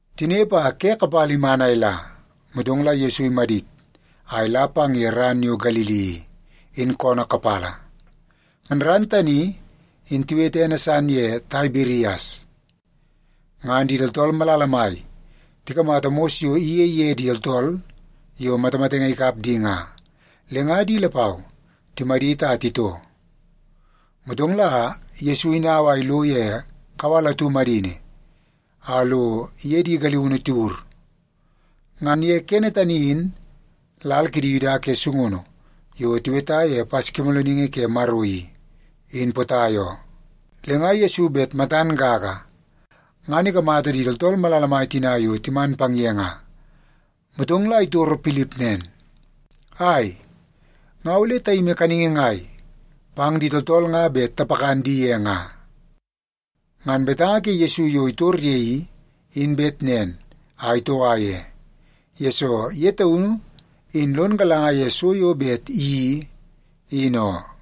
Tinepe a ke kapala iman a ila, motong la Yesu imadit a ila pang ye ran yo Galili i, in koonoo kapala. Ngan ran tani in tiwete ene san ye Taibirias. Ngan di tooltool malala mai tikamata mos yo iyei ye di tooltool yo matamatenge ikap di nga, le nga di lapau timadit a titoo. Motong la Yesu inau a ilo ye kawal atu madini a lo iye di galiunu tiwur. Ngan ye kene tani in, lal kidi Yuda ke sungunu yo tiweta ye Paskimoolooningi ke Maro i, in potai oo. Le nga Yesu bet matan gaga, ngan ikamata di tooltool malala mai tina yo timan pang ye nga, motong la itoro Pilip nen, “Ai, nga ole tayimi kaningi ngai pang di tooltool nga bet tapakan di ye nga?” Ngan betanga ke Yesu yo itor ye i, in bet nen a itoua ye, yesoo ye taunu in lon galanga ye so yo bet iyeii, in oo.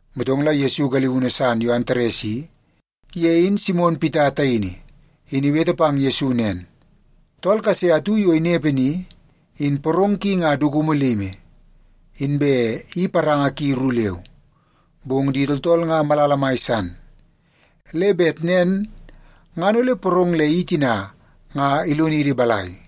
Motong la Yesu galiunu san yo Antares i, ye in Simon Pita taini, in iwete pang Yesu nen, “Tool kase atu yo inepe ni, in porong ki nga dukumu limi, inbe i paranga ki ru leu. Bong di tooltool nga malala mai san. Le bet nen ngan ole porong le i tina nga ilonidi balai?”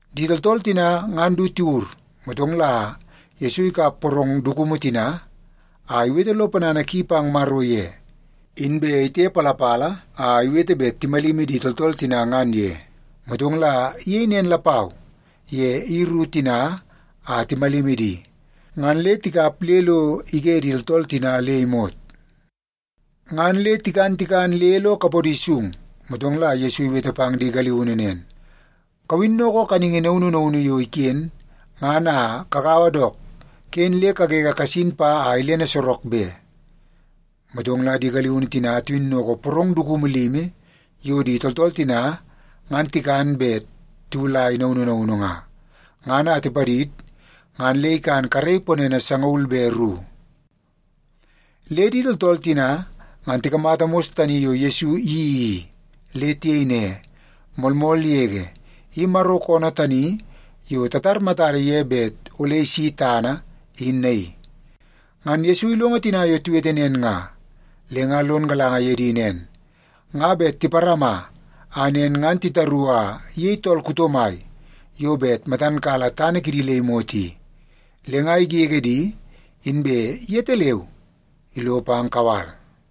Di tooltool tina ngan du tiwur, motong la Yesu ikap porong dukumu tina a iwete lo ponana ki pang Maro ye, inbe itepalapala a iwete bet timalimi di tooltool tina ngan ye. Motong la iyei nen lapau ye i ru tina a timalimi di, ngan le tikap le lo ige di tooltool tina le imot. Ngan le tikan tikan le lo kapodi sung, motong la Yesu iwete pang di galiunu nen, “Kawinnoko kaningi naunu naunu yo iken ngan a kagaua dook, ken le kagege kasin pa a ilene sorok be.” Motong la di galiunu tina tiwinnoko porong dukumu limi yo di tooltool tina ngan tikan bet tiwulai naunu naunu nga, ngan a tipadid ngan le ikan karei ponene sangaul be ru. Le di tooltool tina ngan tikamata mos tani yo Yesu iyeii i, le tiyei ne, “Moolmool yege, i Maro koonoo tani yo tatar matada ye bet ole isi tana, in naii.” Ngan Yesu ilongo tina yo tiwete nen nga, le nga lon galanga ye di nen, nga bet tiparama a nen ngan titaru a iyei tool kuto mai yo bet matan kala tana kidi le imot i. Le nga igege di, inbe yetaleu ilo pang kawal.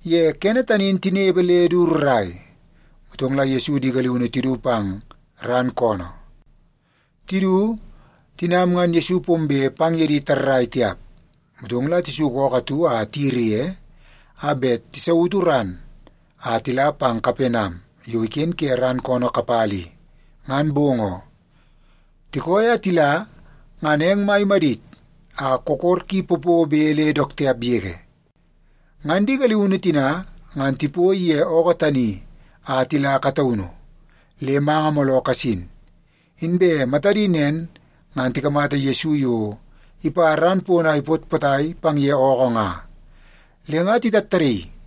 Ye kene tani in tinepe le du rrai, motong la Yesu di galiunu tidu pang ran koonoo. Tidu, tinam ngan Yesu pombe pang ye di tarrai tiap. Motong la tisuku ookoo atu a tiyiri ye, a bet tisautu ran a tila pang Kapenam yo iken ke ran koonoo kapala i, ngan bong oo. Tikooi a tila, ngan eng mai imadit a kokor ki popobe le dook tiap yege. Ngan di galiunu tina, ngan tipoi ye ookoo tani a tila kataunu, le manga mooloo kasin. Inbe matadi nen ngan tikamata Yesu yo ipa ran pono a ipot potai pang ye ookoo nga, le nga titattadaii.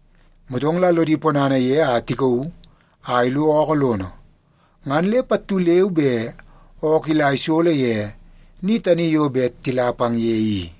Motong la lodi ponana ye a tikauu a ilo ookoo lono, ngan le pattu leu be ookoo ila isolo ye ni tani yo bet tila pang ye i.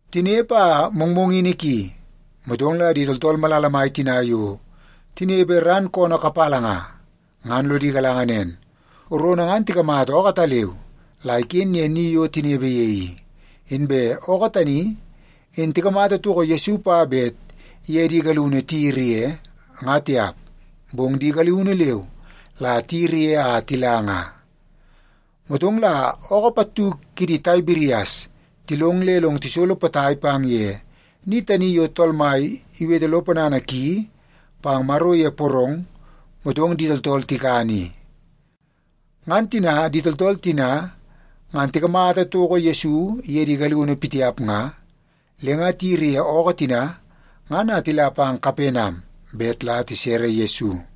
Tinepe a mongmongini ki, motong la di tooltool malala mai tina yo tinepe ran koonoo kapala nga, ngan lodi galanga nen, rono ngan tikamata ookoo ataleu la iken ye ni yo tinepe ye i. Inbe ookoo tani in tikamata toko Yesu pa bet iye di galiunu tiyiri ye, nga tiap, bong di galiunu leu la tiyiri ye a tila nga. Motong la ookoo pattu kidi Taibirias tilong le long tisolo potai pang ye ni tani yo Tool Mai iwete lo ponana ki pang Maro ye porong, motong di tooltool tikan i. Ngan tina di tooltool tina ngan tikamata toko Yesu iye di galiunu pitiap nga, le nga tiyiri ye ookoo tina ngan a tila pang Kapenam bet la tisere Yesu.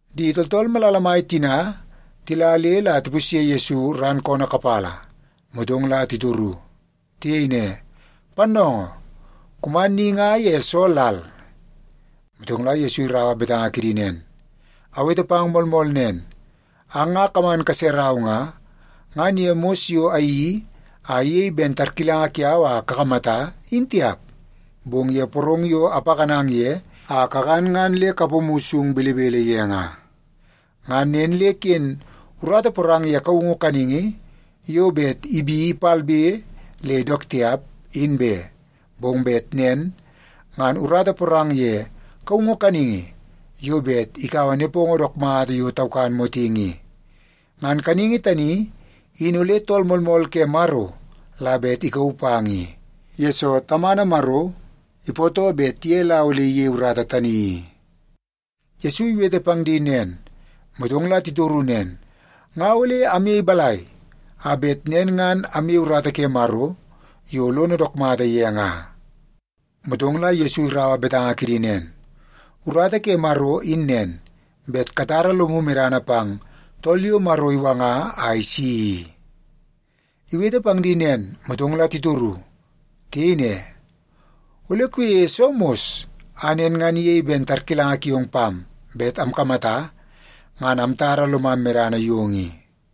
Di tooltool malala mai tina tila le la tipusye Yesu ran koonoo kapala, motong la titoru. Tiyei ne, “Pannoongoo, kuman ni nga ye soo lal?” Motong la Yesu iraua betanga kidi nen, “Awete pang moolmool nen, ang nga kaman kaserau nga, ngan ye mos yo ayeii a iyei ben tarkilanga kiau a kakamata, in tiap, bong ye porong yo apakanang ye a kakan ngan le kapomu sung belebele ye nga. Ngan nen le ken urata porang ye kaungu kaningi yo bet ibi palbe le dook tiap, in be, bong bet nen ngan urata porang ye kaungu kaningi yo bet ikaua nepongo dook mata yo taukan motingi i. Ngan kaningi tani in ole Tool Moolmool ke Maro la bet ikauu pang i, yesoo Tamana Maro ipootoo bet ye la ole iyei urata tani i.” Yesu iwete pang di nen, motong la titoru nen, “Nga ole amyei balai a bet nen ngan amyei urata ke Maro yo lono dook mata ye nga?” Motong la Yesu iraua betanga kidi nen, “Urata ke Maro in nen, bet katara lomu medana pang tool yo Maro iwanga a isi i.” Iwete pang di nen, motong la titoru. Tiyei ne, “Ole kuyeie soo mos a nen ngan iyei ben tarkilanga kiong pam bet amkamata, ngan amtara lomam medana yong i?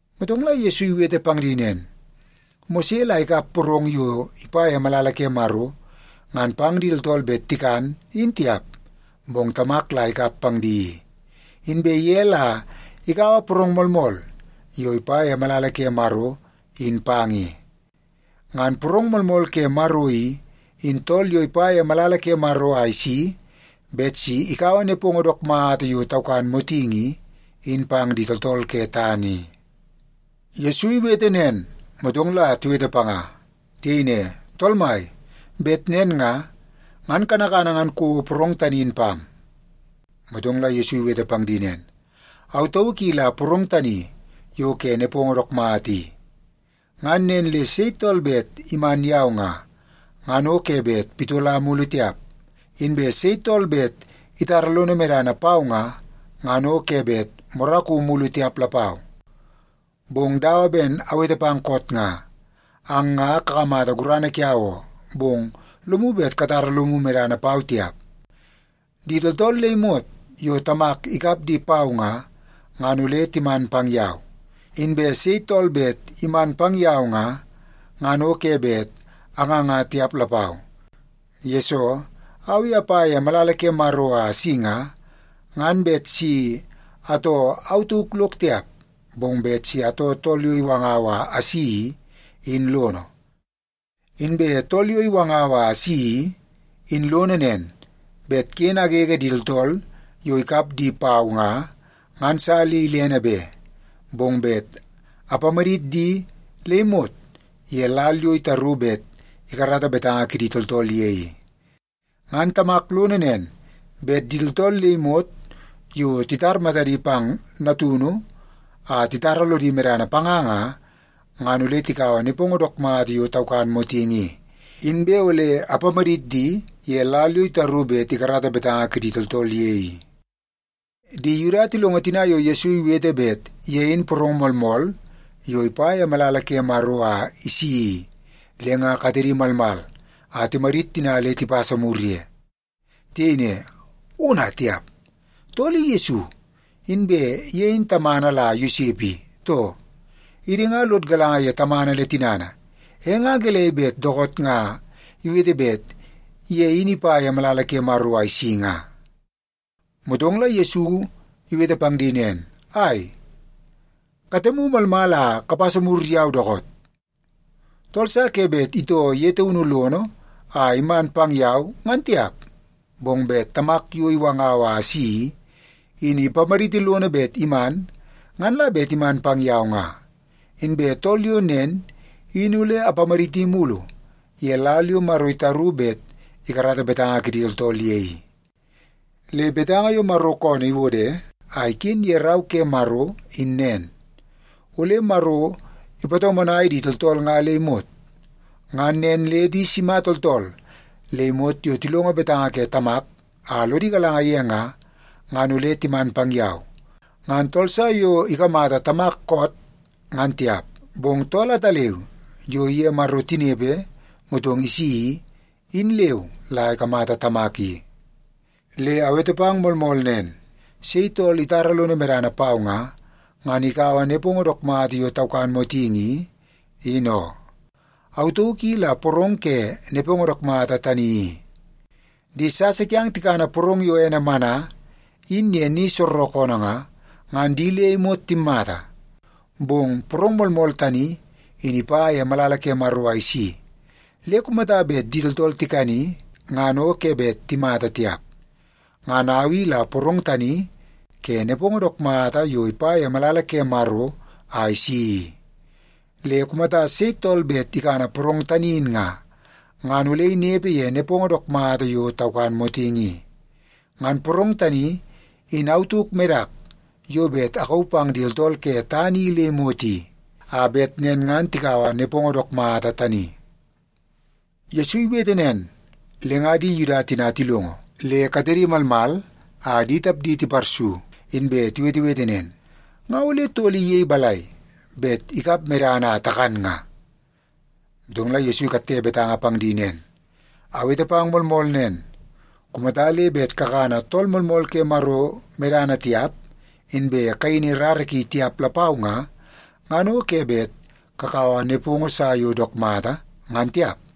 Motong la Yesu iwete pang di nen, “Mose la ikap porong yo ipa ye malala ke Maro ngan pang di tooltool bet tikan, in tiap, bong Tamak la ikap pang di i. Inbe ye la ikaua porong moolmool yo ipa ye malala ke Maro, in pang i. Ngan porong moolmool ke Maro i, in tool yo ipa ye malala ke Maro a isi bet si ikaua nepongo dook mata yo taukan motingi i, in pang di tooltool ke tana i.” Yesu iwete nen, motong la tiwete panga. Tiyei ne, “Tool mai, bet nen nga, ngan kanakana ngan kouo porong tani in pam.” Motong la Yesu iwete pang di nen, “Au tauk i la porong tani yo ke nepongo dook mata i. Ngan nen le sei tool bet iman yau nga, ngan o ke bet pitola mulu tiap. Inbe sei tool bet itara lono medana pau nga, ngan o ke bet moraku mulu tiap lapau. Bong dawa ben awete pang koot nga, ang nga kakamata gurana kiau oo, bong lomu bet katara lomu medana pau tiap. Di tooltool le imot yo Tamak ikap di pau nga, ngan ole timan pang yau. Inbe sei tool bet iman pang yau nga, ngan o ke bet anganga tiap lapau. Yesoo, au i apa ye malala ke Maro a asi nga, ngan bet si atoo au tauk lok tiap, bong bet si atoo Tool yo iwangau a asi i, in lono. Inbe Tool yo iwangau a asi i, in lono nen, bet ken agege di tooltool yo ikap di pau nga, ngan sa le ilene be. Bong bet apamadit di le imot ye lal yo itaru bet ikarata betanga kidi tooltool ye i. Ngan Tamak lono nen, bet di tooltool le imot yo titar matadi pang Natunu a titara lodi medana panga nga, ngan ole tikaua nepongo dook mata yo taukan motingi i, inbe ole apamadit di ye lal yo itaru bet ikarata betanga kidi tooltool ye i.” Di Yuda tilongo tina yo Yesu iwete bet ye in porong moolmool yo ipa ye malala ke Maro a isi i, le nga katedi malmal a timadit tina le tipasa mur ye. Tiyei ne, “Ona tiap! Tool i Yesu, inbe ye in tamana la Yosep i, too? Idi nga lod galanga ye tamana le tinana, e nga gelei bet dookoot nga iwete bet ye in ipa ye malala ke Maro a isi nga?” Motong la Yesu iwete pang di nen, “Ai, katemu malmal a kapasa mur yau dookoot! Tool sa ke bet itoo ye taunu lono a iman pang yau, ngan tiap, bong bet Tamak yo iwangau a asi i, in ipamaditi lono bet iman, ngan la bet iman pang yau nga. Inbe tool yo nen, in ole apamaditi mulu ye lal yo Maro itaru bet ikarata betanga kidi tooltool ye i. Le betanga yo Maro koonoo iwode a iken ye Rau ke Maro in nen, ‘Ole Maro ipatomonai di tooltool nga le imot.’ Ngan nen le di sima tooltool le imot yo tilongo betanga ke Tamak a lodi galanga ye nga, ngan ole timan pang yau. Ngan tool sa yo ikamata Tamak koot, ngan tiap, bong tool ataleu yo iye Maro tinepe motong isi i, in leu la ikamata Tamak i. Le awete pang moolmool nen, sei tool itara lono medana pau nga, ngan ikaua nepongo dook mata yo taukan motingi i, in oo. Au tauk i la porong ke nepongo dook mata tani i. Di sasa kiang tikana porong yo ene mana, in ye ni soorookoonoo nga, ngan di le imot timmata. Bong porong moolmool tani in ipa ye malala ke Maro a isi, le kumata bet di tooltool tikani, ngan o ke bet timmata tiap. Ngan au i la porong tani ke nepongo dook mata yo ipa ye malala ke Maro a isi i. Le kumata sei tool bet ikana porong tani in nga, ngan ole inepe ye nepongo dook mata yo taukan motingi i. Ngan porong tani in au tauk medak yo bet akauu pang di tooltool ke tana i le imot i, a bet nen ngan tikaua nepongo dook mata tani.” Yesu iwete nen, le nga di Yuda tina tilongo, le katedi malmal a di tapdi tiparsu inbe tiwetewete nen, “Nga ole tool i iyei balai bet ikap medana a takan nga?” Motong la Yesu ikatte betanga pang di nen, “Awete pang moolmool nen, kumata le bet kakana Tool Moolmool ke Maro medana tiap, inbe kayini rara ki tiap lapau nga, ngan o ke bet kakaua nepongo sa yo dook mata, ngan tiap.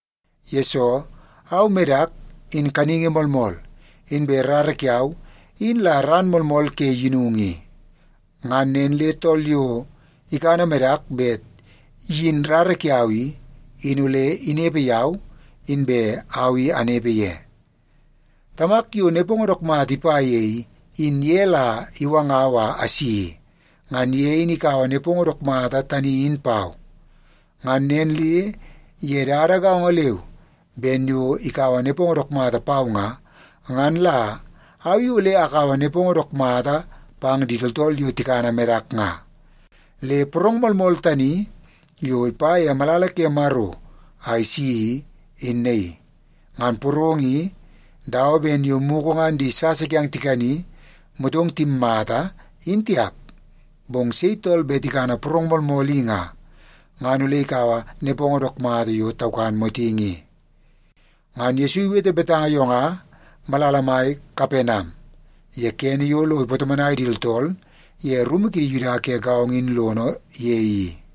Yesoo, au medak in kaningi moolmool, inbe rara kiau in la ran moolmool ke yinungu i. Ngan nen le tool yo ikana medak bet iyin rara kiau i, in ole inepe yau, inbe au i anepe ye. Tamak yo nepongo dook mata ipa ye i, in ye la iwangau a asi i. Ngan ye in ikaua nepongo dook mata tani in pau. Ngan nen le ye dada gaongo leu ben yo ikaua nepongo dook mata pau nga, ngan la au i ole akaua nepongo dook mata pang di tooltool yo tikana medak nga. Le porong moolmool tani yo ipa ye malala ke Maro a isi, in naii. Ngan porong i dawa ben yo mugu ngan di sasa kiang tikani, motong timmata, in tiap. Bong sei tool bet ikana porong moolmool i nga, ngan ole ikaua nepongo dook mata yo taukan motingi i.” Ngan Yesu iwete betanga yo nga malala mai Kapenam, ye kene yo lo ipatomonai di tooltool ye rumu kidi Yuda ke gaongo in lono ye i.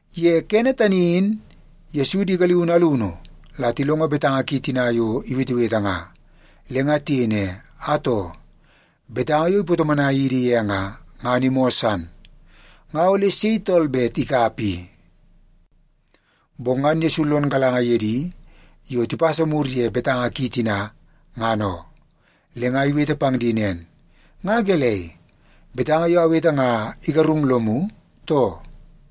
Ye kene tani in Yesu di galiunu alunu la tilongo betanga ki tina yo iwetewete nga, le nga tiyei ne, “Atoo, betanga yo ipatomonai idi ye nga, ngan imoo san. Nga ole sei tool bet ikap i?” Bong ngan Yesu lon galanga ye di yo tipasa mur ye betanga ki tina, ngan oo. Le nga iwete pang di nen, “Nga gelei, betanga yo awete nga igarung lomu, too?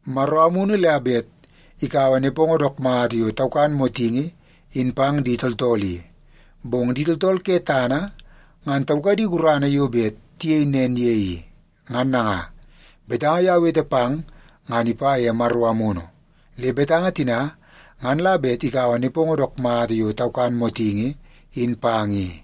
Maro Amunu la bet ikaua nepongo dook mata yo taukan motingi in pang di tooltool i. Bong di tooltool ke tana ngan taukadi gurana yo bet tiyei nen ye i. Ngan nanga, betanga yo awete pang ngan ipa ye Maro Amunu, le betanga tina ngan la bet ikaua nepongo dook mata yo taukan motingi in pang i.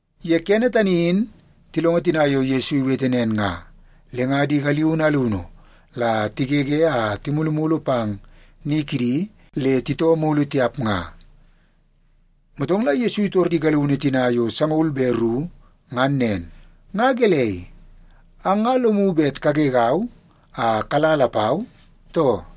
Ye kene tani in tilongo tina yo Yesu iwete nen nga, le nga di galiunu alunu la tigege a timulumulu pang ni kidi le titoo mulu tiap nga. Motong la Yesu itor di galiunu tina yo sangaul be ru ngan nen, “Nga gelei, ang nga lomu bet kagegau a kala lapau, too?”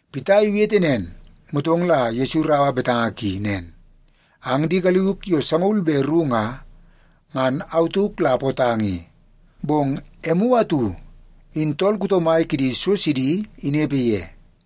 Pita iwete nen, motong la Yesu iraua betanga ki nen, “Ang di galiuk yo sangaul be ru nga, ngan au tauk la apootang i. Bong emu atu in tool kuto mai kidi so sidi inepe ye!”